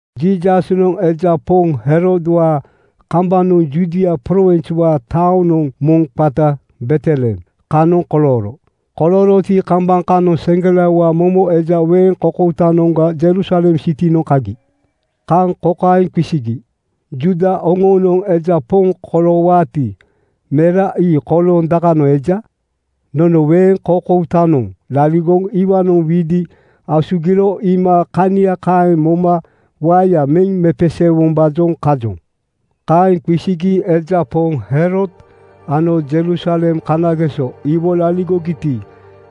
Jiisasnoŋ eja poŋ Herodwaa kambanoŋ Judia prowinswaa taoŋa moŋ qata Betlehem kanoŋ kolooro. Kolooroti, kambaŋ kanoŋ seŋgelaowaa momo eja weeŋ koukoutanoŋga Jerusalem sitinoŋ kagi. Kaŋ kokaeŋ qisigi, “Juuda oŋoonoŋ eja poŋ koloowaati, mera ii kolooŋ dakanoŋ eja? Nono weeŋ koukoutanoŋ laligoŋ iwaanoŋ widi asugiro iima kania kaeŋ moma waeya meŋ mepeseewombaajoŋ kajoŋ.” Kaeŋ qisigi eja poŋ Herod ano Jerusalem kanageso iwo laligogiti,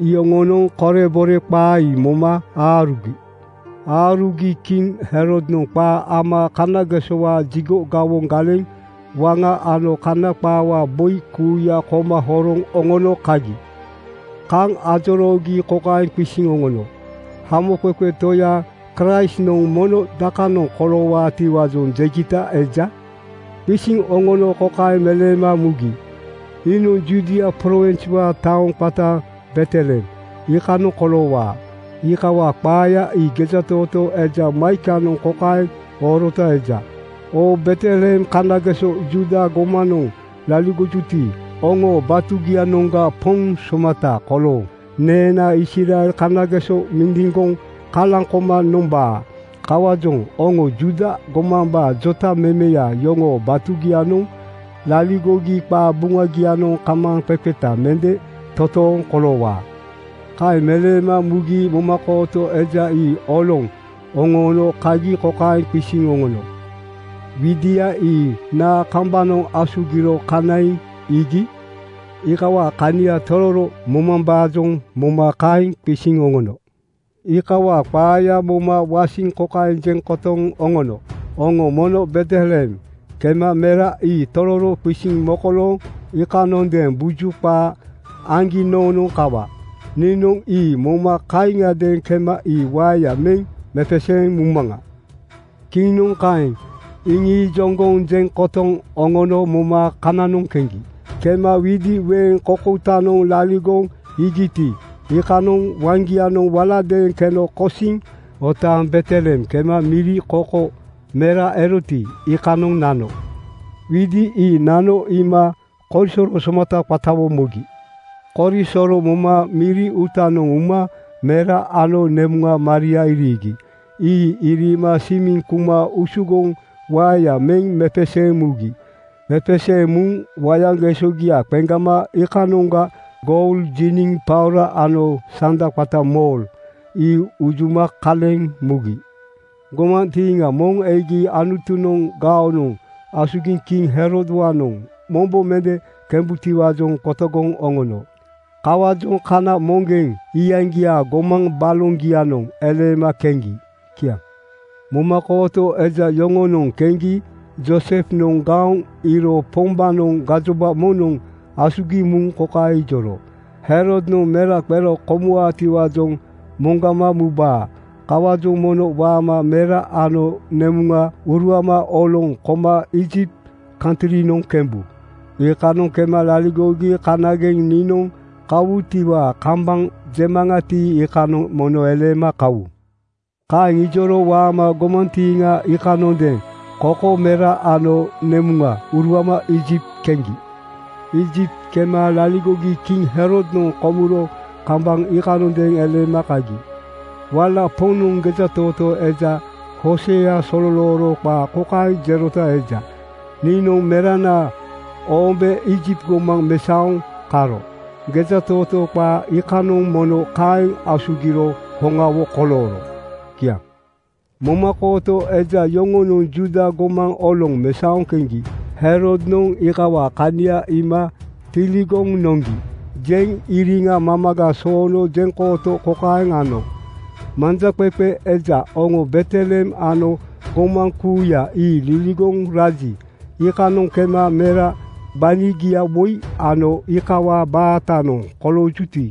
iyoŋonoŋ korebore qaa ii moma aarugi. Aarugi kiŋ Herodnoŋ qaa ama kanagesowaa jigo gawoŋ galeŋ waŋa ano Kana qaawaa boi kuuya koma horoŋ oŋono kagi. Kaŋ ajoroogi kokaeŋ qisiŋ oŋono, “Hamoqeqe Toya Kraistnoŋ mono dakanoŋ koloowaatiwaajoŋ jegita eja?” Qisiŋ oŋono kokaeŋ meleema mugi, “Iinoŋ Judia prowinswaa taoŋ qata Betlehem iikanoŋ koloowaa. Iikawaa qaaya ii gejatootoo eja Maikanoŋ kokaeŋ oorota eja, ‘Oo Betlehem kanageso Juuda gomanoŋ laligojuti, oŋoo batugianoŋga poŋ somata kolooŋ neenaa Israel kanageso mindiŋgoŋ kalaŋ koma nonombaa. Kawaajoŋ oŋo Juuda gomambaa jotamemeya yoŋoo batugianoŋ laligogi qabuŋagianoŋ kamaaŋqeqeta mende toontooŋ koloowaa.’” Kaeŋ meleema mugi momakooto eja ii oloŋ oŋoono kagi kokaeŋ qisiŋ oŋono, “Widia ii naa kambanoŋ asugiro kanaiŋ iigi?” Iikawaa kania tororo momambaajoŋ moma kaeŋ qisiŋ oŋono. Iikawaa qaaya moma wasiŋ kokaeŋ jeŋ kotoŋ oŋono, “Oŋo mono Betlehem kema mera ii tororo qisiŋ mokolooŋ iikanondeeŋ buju qaa aŋgi noonoŋ kawa. Niinoŋ ii moma kaaŋiadeeŋ kema ii waeya meŋ mepeseeŋ mumaŋa.” Kiŋnoŋ kaeŋ iŋiijoŋgoŋ jeŋ kotoŋ oŋono moma kananoŋ keŋgi. Kema widi weeŋ koukoutanoŋ laligoŋ iigiti, iikanoŋ waŋgianoŋ waladeeŋ keno kosiŋ otaaŋ Betlehem kema miri koko mera eroti, iikanoŋ nano. Widi ii nano iima korisoro somata qatawo mogi. Korisoro moma miri uutanoŋ uma mera ano nemuŋa Maria iriigi. Ii iriima simiŋ kuma usugoŋ waeya meŋ mepeseeŋ mugi. Mepeseeŋ muŋ wayaŋgesogia qeŋgama iikanoŋga goul, jiniŋ paora ano sanda qata mor ii unjuma kaleŋ mugi. Gomantiiŋa moŋ egi Anutunoŋ gaonoŋ asugiŋ kiŋ Herodwaanoŋ mombo mende kembutiwaajoŋ qotogoŋ oŋono. Kawaajoŋ kana moŋgeŋ iyaŋgiaa gomaŋ baloŋgianoŋ eleema keŋgi. Kiaŋ. Momakooto eja yoŋonoŋ keŋgi Joosefnoŋ gaoŋ iiro Pombaanoŋ gajoba moŋnoŋ asugiŋ muŋ kokaeŋ ijoro, “Herodnoŋ mera qero komuwaatiwaajoŋ moŋgama mubaa. Kawaajoŋ mono waama mera ano nemuŋa uruama oloŋ koma Iijipt kantrinoŋ kembu. Iikanoŋ kema laligogi kanageŋ niinoŋ kawutiwaa kambaŋ jemaŋati, iikanoŋ mono eleema kawu.” Kaeŋ ijoro waama gomantiiŋa iikanondeeŋ koko mera ano nemuŋa uruama Iijipt keŋgi. Iijipt kema laligogi kiŋ Herodnoŋ komuro kambaŋ iikanondeeŋ eleema kagi. Wala Poŋnoŋ gejatootoo eja Hoosea sololooro qaa kokaeŋ jerota eja, “Niinoŋ merana oombe Iijipt gomaŋ mesaoŋ karo.” Gejatootoo qaa iikanoŋ mono kaeŋ asugiro hoŋawo kolooro. Kiaŋ. Momakooto eja yoŋonoŋ Juuda gomaŋ oloŋ mesaoŋ keŋgi Herodnoŋ iikawaa kania iima “Tiligoŋ noŋgi,” jeŋ iriŋa mamaga soono jeŋkooto kokaeŋ ano, “Manjaqeqe eja, oŋo Betlehem ano gomaŋ kuuya ii liligoŋ raji, iikanoŋ kema mera gbanigia woi ano iikawaa baatanoŋ koloojuti,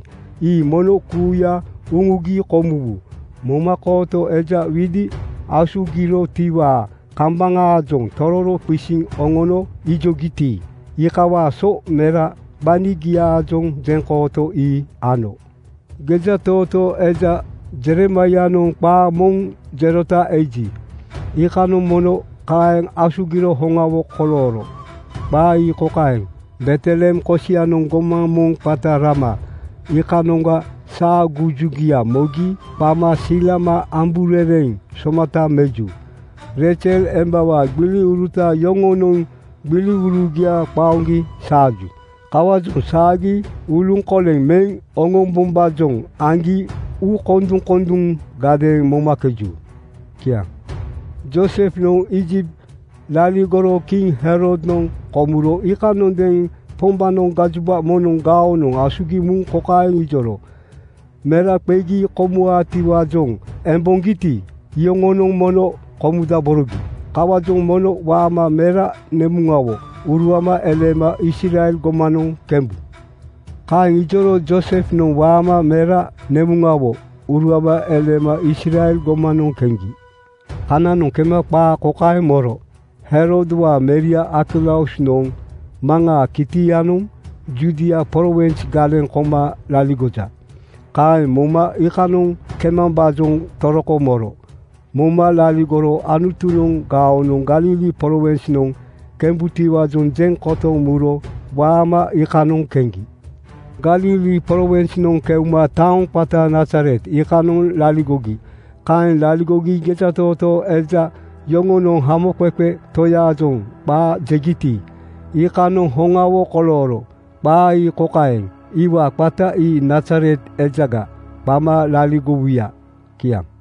ii mono kuuya uŋugi komuwu.” Momakooto eja widi asugirotiwaa kambaŋaajoŋ tororo qisiŋ oŋono ijogiti, iikawaa so mera gbanigiaajoŋ jeŋkooto ii ano. Gejatootoo eja Jeremaianoŋ qaa moŋ jerota eji, iikanoŋ mono kaeŋ asugiro hoŋawo kolooro. Qaa ii kokaeŋ, “Betlehem kosianoŋ gomaŋ moŋ qata Rama iikanoŋga saagujugia mogi qama silama amburereŋ somata meju. Reizel embawaa gbiliuruta yoŋonoŋ gbiliurugia qaoŋgi saaju. Kawaajoŋ saagi uluŋkoleŋ meŋ oŋombombaajoŋ aŋgi uukonduŋkonduŋgadeeŋ momakeju.” Kiaŋ. Joosefnoŋ Iijipt laligoro kiŋ Herodnoŋ komuro iikanondeeŋ Pombaanoŋ gajoba moŋnoŋ gaonoŋ asugiŋ muŋ kokaeŋ ijoro, “Mera qegi komuwaatiwaajoŋ emboŋgiti, iyoŋonoŋ mono komudaborogi. Kawaajoŋ mono waama mera nemuŋawo uruama eleema Israel gomanoŋ kembu.” Kaeŋ ijoro Joosefnoŋ waama mera nemuŋawo uruama eleema Israel gomanoŋ keŋgi. Kananoŋ kema qaa kokaeŋ moro, “Herodwaa meria Arkelausnoŋ maŋaa kitianoŋ Judia prowins galeŋ koma laligoja.” Kaeŋ moma iikanoŋ kemambaajoŋ toroko moro. Moma laligoro Anutunoŋ gaonoŋ Galili prowinsnoŋ kembutiwaajoŋ jeŋ kotoŋ muro waama iikanoŋ keŋgi. Galili prowinsnoŋ keuma taoŋ qata Nazaret iikanoŋ laligogi. Kaeŋ laligogi gejatootoo eja yoŋonoŋ Hamoqeqe Toyaajoŋ qaa jegiti, iikanoŋ hoŋawo kolooro. Qaa ii kokaeŋ, “Iwaa qata ii Nazaret ejaga qama laligowuya.” Kiaŋ.